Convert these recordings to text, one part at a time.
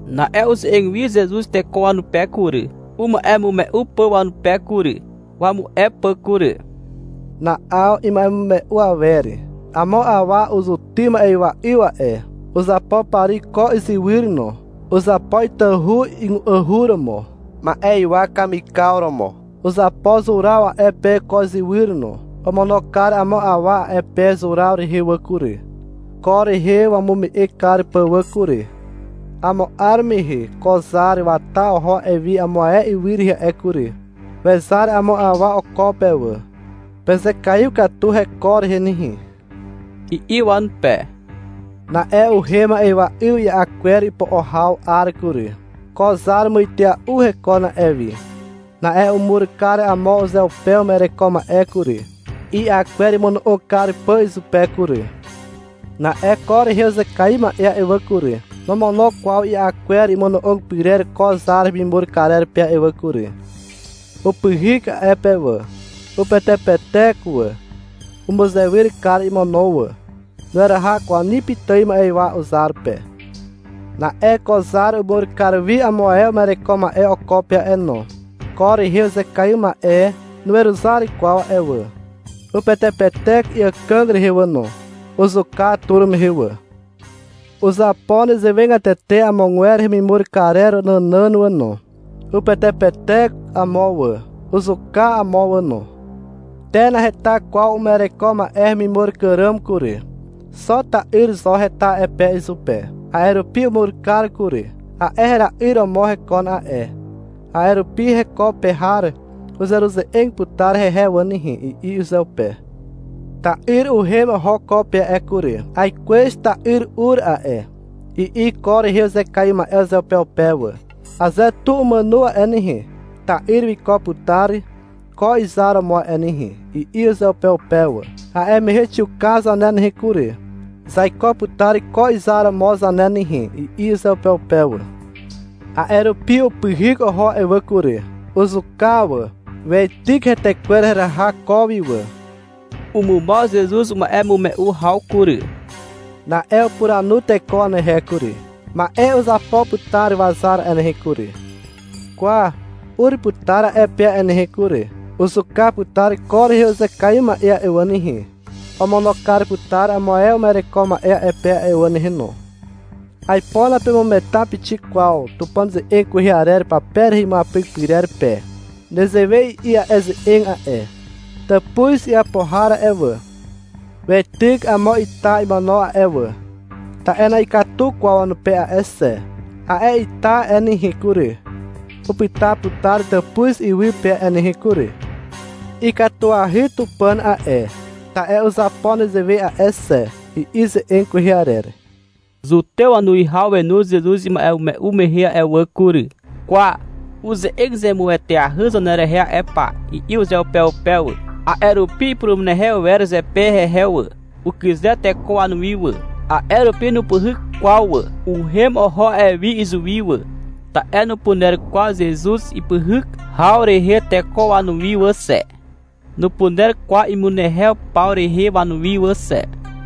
Na'e uze'eg wi Zezuz teko wanupe kury, uma'emume'u pà wanupe kury, wamu'e pà kury. Na'aw ima'emume'u awer. — Amo awa uzutym ma'ywa'yw a'e. Uzapo pari ko izywyr no. Uzapo itahu ygu'ahu romo, ma'ywa kamikaw romo. Uzapo zuraw a'e pe ko izywyr no. Omono kar amo awa a'e pe zuraw rehe wà kury, ko rehe wamume'e kar pà wà kury. Amo 'ar mehe ko zar wata oho a'e wi amo ae ywy rehe a'e kury. Wezar amo awa oko pe wà. — Pezekaiw katu heko rehe nehe, i'i wanupe. Na'e uhem ma'ywa'yw i'a kwer ipo'o haw 'ar kury. Ko zar muitea'u hekon a'e wi. Na'e umur kar amo uzeupe uma'ereko ma'e kury, i'a kwer imono'og kar pà izupe kury. Na'e ko rehe uzekaiw ma'e a'e wà kury, nomono kwaw i'a kwer imono'og pyrer ko zar hemimur karer pe a'e wà kury. Upyhyk a'e pe wà, upetepetek wà, umuzewyr kar imono wà. Nueraha kwaw ni pitài ma'ywa uzar pe. Na'e ko zar umur kar wi amo ae uma'ereko ma'e oko pe a'e no. Ko rehe uzekaiw ma'e nuweruzar kwaw a'e wà. Upetepetek iàkàg rehe wà no. Uzuka tur mehe wà. Uzapo nezewegatete amogwer hemimur karer nànàn wà no. Upetepetek amo wà. Uzuka amo wà no. Te, naheta kwaw uma'ereko ma'e hemimur kar ràm kury. Xo ta'yr zo heta a'e pe izupe. A'e rupi umur kar kury. — A'e hera'yr romo hekon a'e, a'e rupi heko pe har uzeruze'eg putar hehe wà nehe, i'i uzeupe. Ta'yr uhem oho ko pe a'e kury. — Aikwez ta'yr ur a'e, i'i ko rehe uzekaiw ma'e uzeupeupe wà. — Aze tu umàno a'e nehe, ta'yr wiko putar ko zar romo a'e nehe, i'i uzeupeupe wà. — A'e mehe xiuka zane nehe kury, zaiko putar ko zar romo zane nehe, i'i uzeupeupe wà. A'e rupi upyhyk oho a'e wà kury. Uzuka wà. Weityk hetekwer heraha ko wi wà. Umumaw Zezuz uma'emume'u haw kury. Na'e upuranu teko wanehe kury. — Ma'e uzapo putar wazar a'e nehe kury. Kwa, ur putar a'e pe a'e nehe kury. Uzuka putar ko rehe uzekaiw ma'e a'e wà nehe. Omono kar putar amo ae uma'ereko ma'e a'e pe a'e wà nehe no. Aipo napemugeta pixik kwaw Tupàn ze'eg kwehe arer pape rehe imuapyk pyrer pe. Nezewe i'i a'e ze'eg a'e. — Tàpuz iapo har a'e wà, weityk amo ita imono a'e wà. Ta'e na'ikatu kwaw wanupe a'e xe. A'e ita a'e nehe kury, upyta putar tàpuz iwy pe a'e nehe kury. Ikatuahy Tupàn a'e, ta'e uzapo nezewe a'e xe, i'i ze'eg kwehe arer. Zutew wanuwihaw wenu Zezuz ima'emume'u mehe a'e wà kury. — Kwa, uze'eg zemueteahy zanerehe a'e pa, i'i uzeupeupe wà. A'e rupi ipurumunehew wer zepe hehe wà. Ukyze teko wanuwi wà. A'e rupi nupyhyk kwaw wà. Uhem oho a'e wi izuwi wà. Ta'e nupuner kwaw Zezuz ipyhyk haw rehe teko wanuwi wà xe. Nupuner kwaw imunehew paw rehe wanuwi wà xe.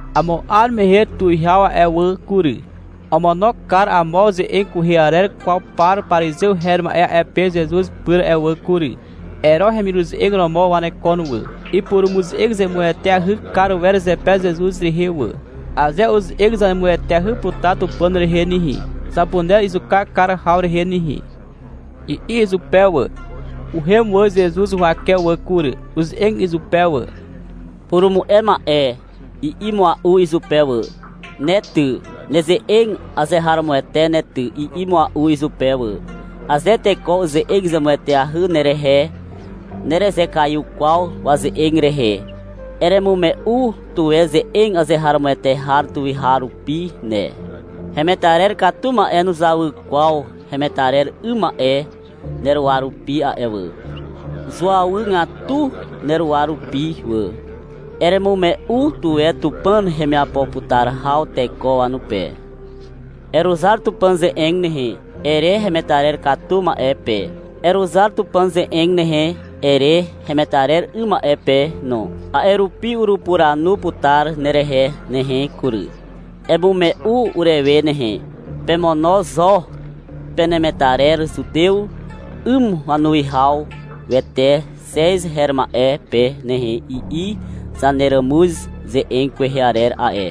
Amo 'ar mehe tuwihaw a'e wà kury, omono kar amo ze'eg kwehe arer kwaw par parizew her ma'e a'e pe Zezuz pyr a'e wà kury. Ero hemiruze'eg romo wanekon wà. Ipurumuze'eg zemueteahy kar wer zepe Zezuz rehe wà. — Aze uze'eg zemueteahy putar Tupàn rehe nehe, zapuner izuka kar haw rehe nehe, i'i izupe wà. Uhem wà Zezuz huwake wà kury. Uze'eg izupe wà. — Purumu'e ma'e, i'i mua'u izupe wà. — Ne ty, neze'eg azeharomoete ne ty, i'i mua'u izupe wà. — Aze teko uze'eg zemueteahy nerehe, nerezekaiw kwaw waze'eg rehe. Eremume'u tuwe ze'eg azeharomoete har tuweharupi ne. Hemetarer katu ma'e nuzawy kwaw hemetarer 'ym ma'e neruwa rupi a'e wà. Zuawygatu neruwa rupi wà. Eremume'u tuwe Tupàn hemiapo putar haw teko wanupe. — Eruzar Tupàn ze'eg nehe, ere hemetarer katu ma'e pe. — Eruzar Tupàn ze'eg nehe, ere hemetarer 'ym ma'e pe no. A'e rupi urupuranu putar nerehe nehe kury. Emume'u urewe nehe. — Pemono zo penemetarer zutew 'ym wanuwihawete Xez her ma'e pe nehe, i'i zaneràmuz ze'eg kwehe arer a'e.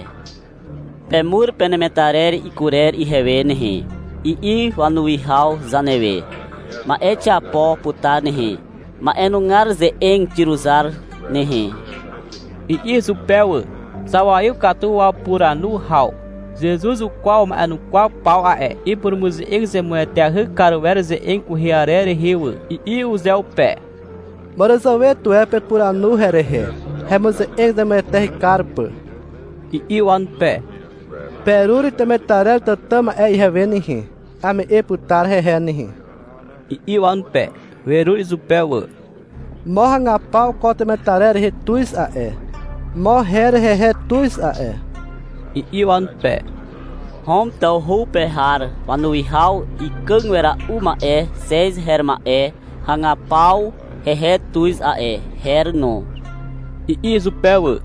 — Pemur penemetarer ikurer ihewe nehe, i'i wanuwihaw zanewe. Ma'e xiapo putar nehe. Ma'enugar ze'eg xiruzar nehe, i'i izupe wà. (Zawaiw katu wapuranu haw.) Zezuz ukwaw wama'enukwaw paw a'e. — Ipurumuze'eg zemueteahy kar wer ze'eg kwehe arer rehe wà, i'i uzeupe. — Màràzàwe tuwe pepuranu herehe, hemuze'eg zemueteahy kar pà, i'i wanupe. — Perur temetarer tàtà ma'e ihewe nehe. Ame'e putar hehe nehe, i'i wanupe. Werur izupe wà. — Mo ragapaw ko temetarer rehe tuz a'e, mo her hehe tuz a'e, i'i wanupe. — Hom tawhu pe har wanuwihaw ikàg wera'u ma'e Xez her ma'e hagaw paw hehe tuz a'e, her no, i'i izupe wà.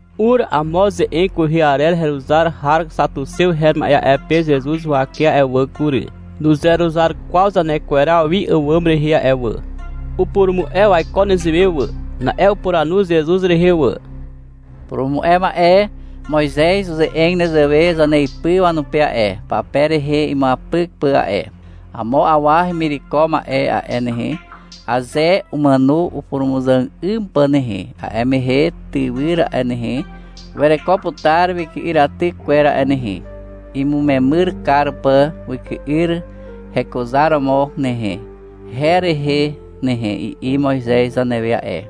Ur amo ze'eg kwehe arer heruzar har xatuxew her ma'e a'e pe Zezuz huwake a'e wà kury. (Nuzeruzar kwaw zanekweraw wi àwàm rehe a'e wà. Upurumu'e waiko nezewe wà.) Na'e upuranu Zezuz rehe wà. — Purumu'e ma'e. Moizez uze'eg nezewe zaneipy wanupe a'e, pape rehe imuapyk pà a'e. Amo awa hemireko ma'e a'e nehe, aze umàno upurumuzàg 'ym pà nehe, a'e mehe tywyr a'e nehe, wereko putar wyky'yraty kwer a'e nehe, imumemyr kar pà wyky'yr hekuzaromo nehe, her rehe nehe, i'i Moizez zanewe a'e.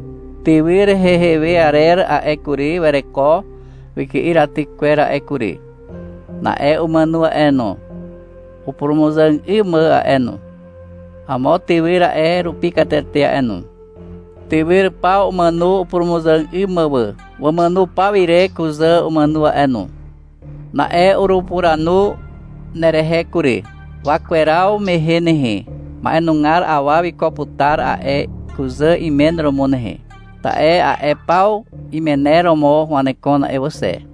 Tywyr hehe we arer a'e kury, wereko wyky'yraty kwer a'e kury. Na'e umàno a'e no, upurumuzàg 'ym mà a'e no. Amo tywyr a'e rupi katete a'e no. Tywyr paw umàno upurumuzàg 'ym mà wà. Wamàno paw ire kuzà umàno a'e no. Na'e urupuranu nerehe kury. Wakweraw mehe nehe, ma'enugar awa wiko putar a'e kuzà imen romo nehe. Ta'e a'e paw imener romo wanekon a'e wà xe.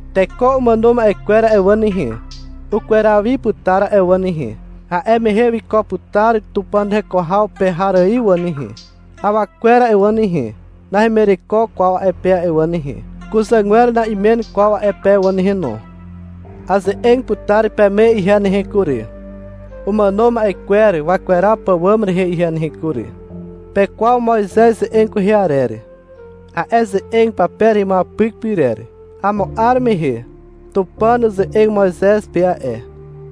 Teko umàno ma'e kwer a'e wà nehe, ukweraw wi putar a'e wà nehe. A'e mehe wiko putar Tupàn heko haw pe har ài wà nehe. Awa kwer a'e wà nehe, nahemireko kwaw a'e pe a'e wà nehe. Kuzàgwer na'imen kwaw a'e pe wà nehe no. Aze'eg putar peme ihe nehe kury, umàno ma'e kwer wakweraw pàwàm rehe ihe nehe kury. Pekwaw Moizez ze'eg kwehe arer, a'e ze'eg pape rehe imuapyk pyrer. Amo 'ar mehe Tupàn uze'eg Moizez pe a'e,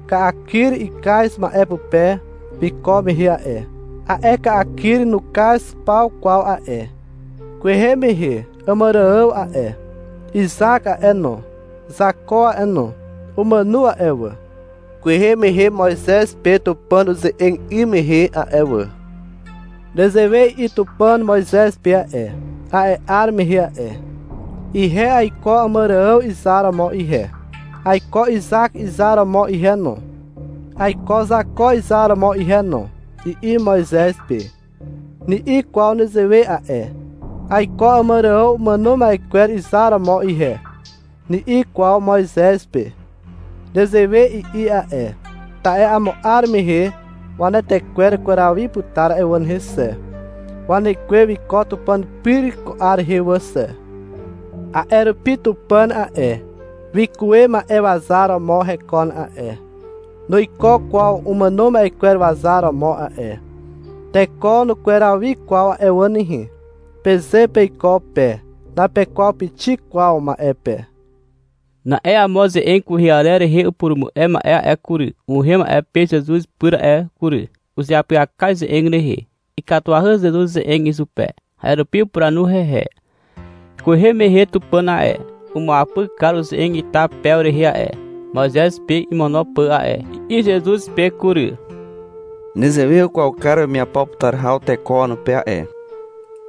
ka'a kyr ikaz ma'e pupe wiko mehe a'e. A'e ka'a kyr nukaz paw kwaw a'e. Kwehe mehe Àmàrààw a'e, Izak a'e no, Zako a'e no, umàno a'e wà, kwehe mehe Moizez pe Tupàn uze'eg 'ym mehe a'e wà. Nezewe i'i Tupàn Moizez pe a'e, a'e 'ar mehe a'e. — Ihe aiko Àmàrààw izar romo ihe, aiko Izak izar romo ihe no, aiko Zako izar romo ihe no, i'i Moizez pe. Ni'i kwaw nezewe a'e. — Aiko Àmàrààw umàno ma'e kwer izar romo ihe, ni'i kwaw Moizez pe. (Nezewe i'i a'e, ta'e amo 'ar mehe wanetekwer ukweraw wi putar a'e wà nehe xe. Wanekwe wiko Tupàn pyr ko 'ar rehe wà xe.) A'e rupi Tupàn a'e, wikuwe ma'e wazar romo hekon a'e, nuiko kwaw umàno ma'e kwer wazar romo a'e. — Teko nukweraw wi kwaw a'e wà nehe, peze peiko pe. Napekwaw pixik kwaw ma'e pe. Na'e amo ze'eg kwehe arer rehe upurumu'e ma'e a'e kury, uhem a'e pe Zezuz pyr a'e kury. Uzeapyaka ize'eg rehe. Ikatuahy Zezuz ze'eg izupe. A'e rupi upuranu hehe, — Kwehe mehe Tupàn a'e, umuapyk kar uze'eg ita pew rehe a'e, Moizez pe imono pà a'e, i'i Zezuz pe kury. — Nezewe ukwaw kar wemiapo putar haw teko wanupe a'e,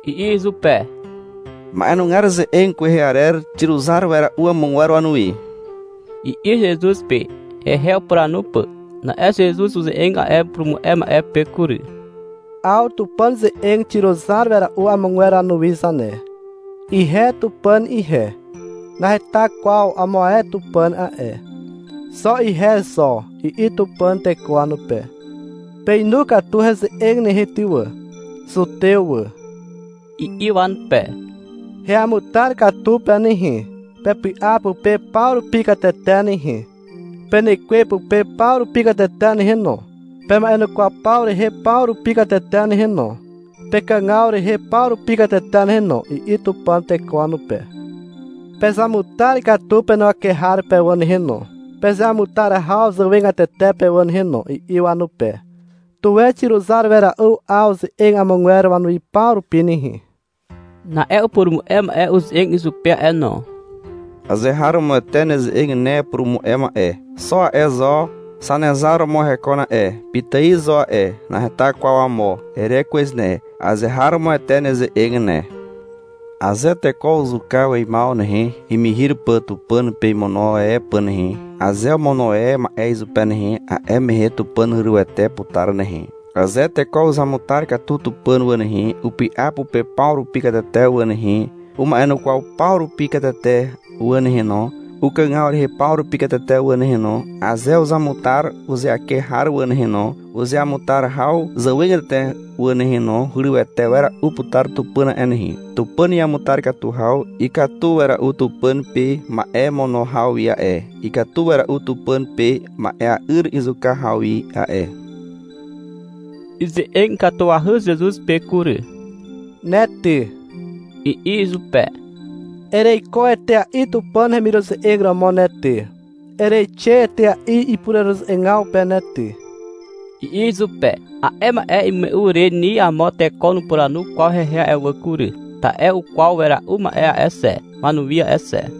i'i izupe. — Ma'e nugar ze'eg kwehe arer xiruzar wera'u amogwer wanuwi, i'i Zezuz pe, hehe upuranu pà. Na'e Zezuz uze'eg a'e upurumu'e ma'e pe kury. — 'Aw Tupàn ze'eg xiruzar wera'u amogwer wanuwi zane. — Ihe Tupàn ihe, naheta kwaw amo ae tupàn a'e, xo ihe zo, i'i Tupàn teko wanupe. Peinu katu heze'eg nehe ty wà, zutew wà, i'i wanupe. Heamutar katu pe nehe, pepy'a pupe paw rupi katete nehe, penekwe pupe paw rupi katete nehe no, pema'enukwaw paw rehe paw rupi katete nehe no, pekàgaw rehe paw rupi katete nehe no, i'i Tupàn teko wanupe. — Pezamutar katu penuwake har pe wà nehe no, pezeamutar haw zàwegatete pe wà nehe no, i'i wanupe. Tuwe xiruzar wera'u 'aw ze'eg amogwer wanuwi paw rupi nehe. Na'e upurumu'e ma'e uze'eg izupe a'e no. — Azeharomoete neze'eg ne, purumu'e ma'e. Xo a'e zo Zanezar romo hekon a'e, pitài zo a'e, naheta kwaw amo, ere kwez ne. Azeharomoete neze'eg ne. Aze teko uzuka weimaw nehe, imihir pà Tupàn pe imono e pà nehe, aze omono e ma'e izupe nehe, a'e mehe Tupàn hurywete putar nehe. Aze teko uzamutar katu Tupàn wà nehe, upy'a pupe paw rupi katete wà nehe, uma'enukwaw paw rupi katete wà nehe no, ukàgaw rehe paw rupi katete wà nehe no, aze uzamutar uzeake har wà nehe no, uzeamutar haw zàwegatete wà nehe no, hurywete wera'u putar Tupàn a'e nehe. Tupàn iamutar katu haw ikatu wera'u Tupàn pe ma'e mono haw wi a'e, ikatu wera'u Tupàn pe ma'ea'yr izuka haw wi a'e. Ize'eg ikatuahy Zezuz pe kury. — Ne ty, i'i izupe. — Ereiko etea'i Tupàn hemiruze'eg romo ne ty, ereixe etea'i ipureruze'egaw pe ne ty, i'i izupe. A'e ma'e imume'u re ni amo teko nupuranu kwaw hehe a'e wà kury. Ta'e ukwaw wera'u ma'e a'e xe, wanuwi a'e xe.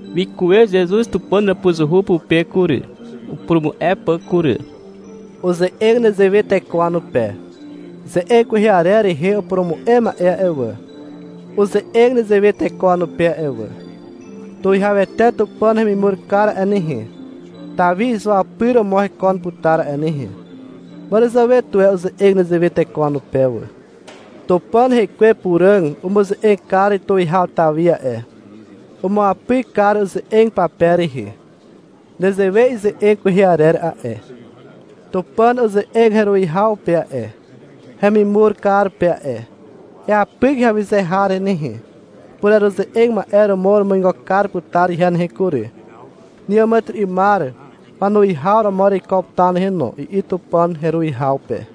Wikuwe Zezuz Tupàn hàpuzuhu pupe kury, upurumu'e pà kury. Uze'eg nezewe teko wanupe. — Ze'eg kwehe arer rehe upurumu'e ma'e a'e wà, uze'eg nezewe teko wanupe a'e wà. Tuwihawete Tupàn hemimur kar a'e nehe, Tawi izuapyr romo hekon putar a'e nehe. Màràzàwe tuwe uze'eg nezewe teko wanupe wà. Tupàn rekwe Puràg umuze'eg kar Tuwihaw Tawi a'e. Umuapyk kar uze'eg pape rehe. Nezewe ize'eg kwehe arer a'e. Tupàn uze'eg heruwihaw pe a'e, wemimur kar pe a'e. — Eapyk heawyze har rehe nehe, pureruze'eg ma'e romo urumuigo kar putar ihe nehe kury, neàmàtyry'ymar wanuwihaw romo ereiko putar nehe no, i'i Tupàn heruwihaw pe.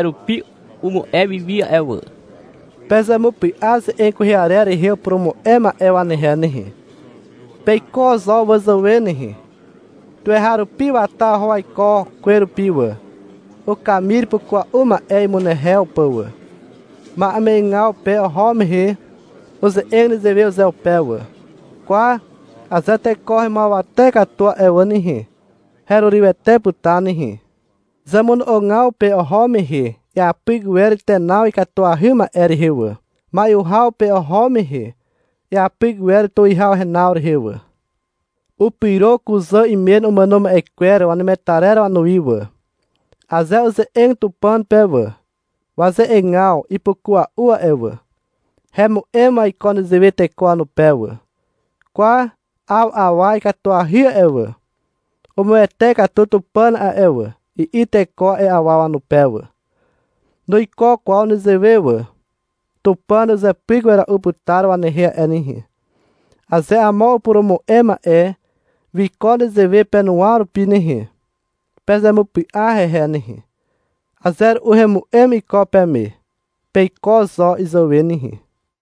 A'e rupi umu'e wiwi a'e wà. — Pezemupy'a ze'eg kwehe arer rehe upurumu'e ma'e wanehe nehe. Peiko zo wazàwe nehe. Tuweharupi wata oho waiko kwerupi wà, ukamir ipukua'u ma'e imunehew pà wà. Ma'eme'egaw pe oho mehe uze'eg nezewe uzeupe wà. — Kwa aze teko hemuawate katu a'e wà nehe, herurywete putar nehe. Zemono'ogaw pe oho mehe iapyk wer tenaw ikatuahy ma'e rehe wà. Mai'u haw pe oho mehe iapyk wer tuwihaw renaw rehe wà. Upyro kuzà imen umàno ma'e kwer wanemetarer wanuwi wà. Aze uze'eg Tupàn pe wà, waze'egaw ipukua'u a'e wà. Hemu'em waiko nezewe teko wanupe wà. — Kwa, 'aw awa ikatuahy a'e wà, umuwete katu Tupàn a'e wà, i'i teko a'e awa wanupe wà. Nuiko kwaw nezewe wà. Tupàn uzepyk wera'u putar wanehe a'e nehe. Aze amo upurumu'e ma'e wiko nezewe penuwa rupi nehe, pezemupy'a hehe nehe. Aze ru'u hemu'em iko peme. Peiko zo izàwe nehe.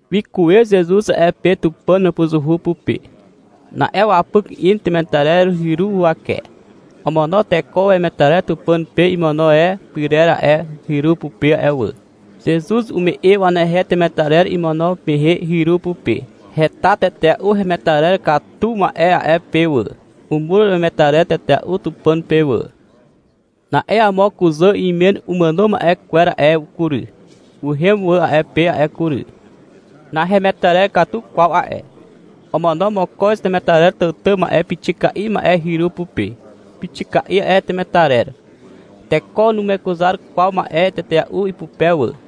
Wikuwe Zezuz a'e pe Tupàn hàpuzuhu pupe. Na'e wapyk in temetarer hyru huwake. Omono teko wemetarer Tupàn pe imono e pyrer a'e hyru pupe a'e wà. Zezuz ume'e wanehe temetarer imono mehe hyru pupe. Heta tetea'u hemetarer katu ma'e a'e pe wà. Umur wemetarer tetea'u Tupàn pe wà. Na'e amo kuzà imen umàno ma'e kwer a'e kury, uhem wà a'e pe a'e kury. Nahemetarer katu kwaw a'e. Omono mokoz temetarer tàtà ma'e pixika'i ma'e hyru pupe. Pixika'i a'e temetarer. Teko numekuzar kwaw ma'e tetea'u ipupe wà.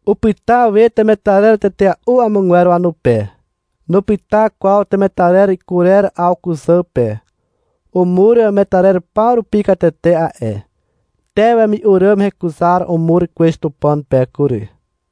Upyta we temetarer tetea'u amogwer wanupe. Nupyta kwaw temetarer kurer 'aw kuzà pe. Umur wemetarer paw rupi katete a'e. Te, wemi'u ràm hekuzar umur kwez Tupàn pe kury.